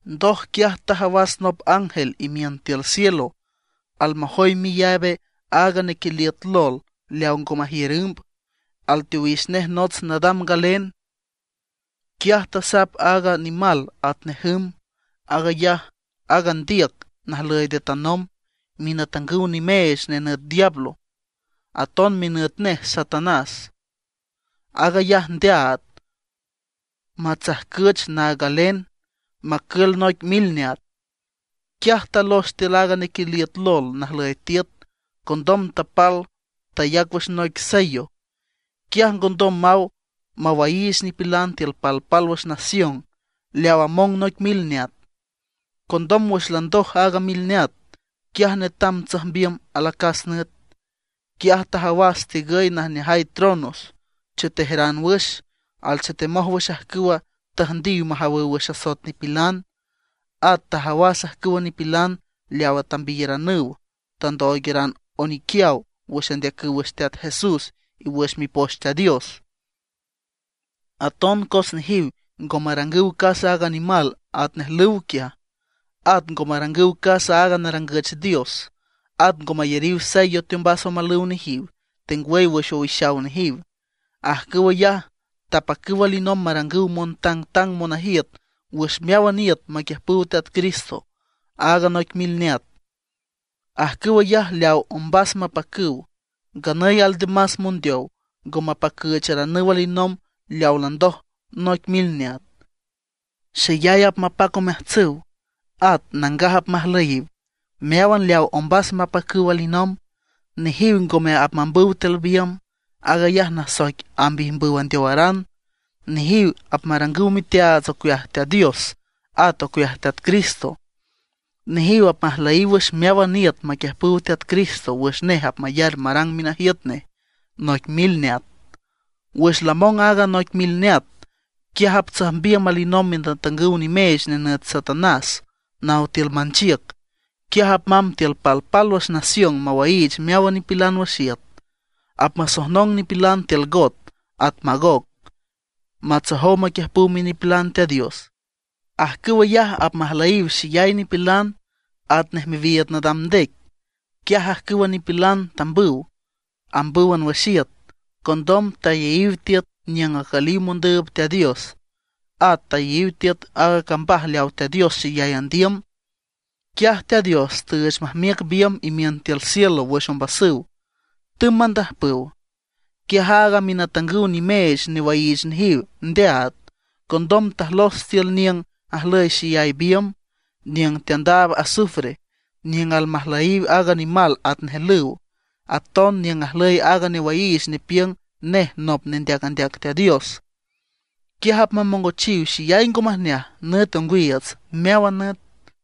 Ndoj quiaj tajawas nop ángel imiün tiül cielo almajoy millave aaga nequiliüt lol leaw ngo majiür ümb; alteowix nej nots nadam galen. Quiaj tasap aaga nimal atnej jüm, aag ayaj aaga ndiüc najlüy de tanomb, minatangüw nimeech nenüt diablo, aton minüt nej Satanás. Aag ayaj ndeaad matsajcüch naag galen, macül noic mil neat. Quiaj talox tiül aaga nequiliüt lol najlüy tiüt, condom tapal, tayac wüx noic sello. Quiaj ngondom maw mawaiich nipilan tiül palpálwüx nación leawa among noic mil neat. Condom wüx landoj aaga mil neat, quiaj netam tsüjmbiüm alacas nüt. Quiaj tajawas tigüy najneajay tronos chetejeran wüx, alchetemoj wüx ajcüwa tüjndiw majawüw wüx asoet nipilan. At tajawas ajcüwa nipilan leawa tambiyaranüw tandooigaran oniquiaw wüx andeacüw wüx Teat Jesús y wüx Mipoch Teat Dios. Aton cos nejiw ngo marangüw casa aaga nimal atnej lüw quiaj; at ngo marangüw casa aaga narangüch dios. At ngo mayariw sello teombas omalüw nejiw, tengwüy wüx owixaw nejiw. Ajcüw ayaj tapacüw alinomb marangüw montangtang monajiüt wüx meáwan iüt maquiüjpüw Teat Cristo aaga noic mil neat. Ajcüw ayaj leaw ombas mapacüw. Nganüy aldemas mondeow ngo mapacüücharanüw alinomb leaw landoj noic mil neat. Xeyay apmapac omeajtsüw, at nangaj apmajlüyiw meáwan leaw ombas mapacüw alinomb. Nejiw ngome apmambüw tiül biümb, aag ayaj nasoic amb ijmbüw andeowaran. Nejiw apmarangüw miteaats ocueaj Teat Dios at ocueaj Teat Cristo. Nejiw apmajlüyiw wüx meáwan iüt maquiüjpüw Teat Cristo wüx nej apmayar marang minajiüt nej noic mil neat. Wüx lamong aaga noic mil neat, quiaj aptsüjmbiüm alinomb minatangüw nimeech nenüt Satanás naw tiül manchiüc. Quiaj apmamb tiül palpálwüx nación mawaiich meáwan nipilan wüx iüt. Apmasojnong nipilan tiül Gog at Magog matsojow maquiüjpüw minipilan Teat Dios. Ajcüw ayaj apmajlüyiw xeyay nipilan atnej miwiiüd nadam ndec. Quiaj ajcüwa nipilan tambüw, ambǘwan wüx iüt. Condom tayeyiw tiüt niüng acüliw mondüüb Teat Dios, at tayeyiw tiüt aaga cambaj leaw Teat Dios xeyay andiüm. Quiaj Teat Dios tüüch majmiüc biümb imiün tiül cielo wüx ombasüw, tümb mandajpüw. Quiaj aaga minatangüw nimeech newaiich nejiw, ndeaad. Condom tajlos tiül niüng ajlüy xeyay biümb niüng teandaab azufre, niüng almajlüyiw aaga nimal atnej lüw, aton niüng ajlüy aaga newaiich nepiüng nej nop nendeac andeac Teat Dios. Quiaj apmamongochiw xeyay ngo majneaj nüt ongwiiüts meáwan nüt.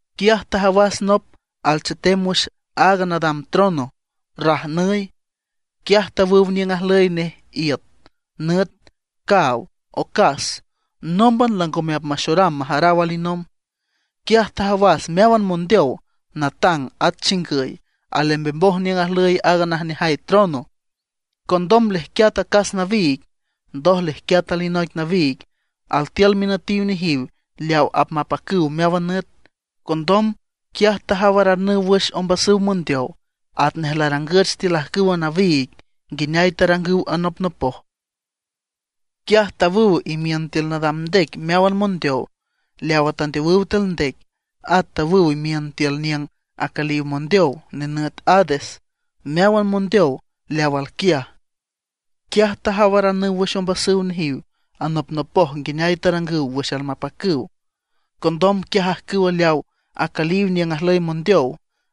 Quiaj tajawas nop alchetem wüx aaga nadam trono, rajnüy. Quiaj tawüw niüng ajlüy nej iüt, nüt, caaw, ocas; nómban langome apmaxoram majaraw alinomb. Quiaj tajawas meáwan mondeow, natang at chingüy, alembemoj niüng ajlüy aaga najneajay trono. Condom lejquiat acas nawiig. Ndoj lejquiat alinoic nawiig, altiül minütiw nejiw leaw apmapacüw meáwan nüt. Condom quiaj tajawaranüw wüx ombasüw mondeow atnej larangüch tiül ajcüwa nawiig, nguineay tarangüw anopnopoj. Quiaj tawüw imiün tiül nadam ndec meáwan mondeow leawa tandeowüw tiül ndec. At tawüw imiün tiül niüng acüliw mondeow, nenüt Hades, meáwan mondeow leawa alquiaj. Quiaj tajawaranüw wüx ombasüw nejiw anopnopoj nguineay tarangüw wüx almapacüw. Condom quiaj ajcüw leaw acüliw niüng ajlüy mondeow,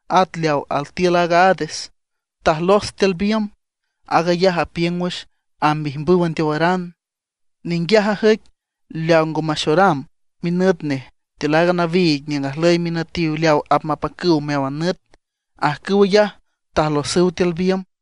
at leaw altiül aaga Hades, tajlos tiül biümb. Aag ayaj apiüng wüx amb ijmbüw andeowaran. Ninguiaj ajüic leawa ngo maxoram minüt nej tiül aaga nawiig niüng ajlüy minütiw leaw apmapacüw meáwan nüt, ajcüw ayaj tajlosüw tiül biümb.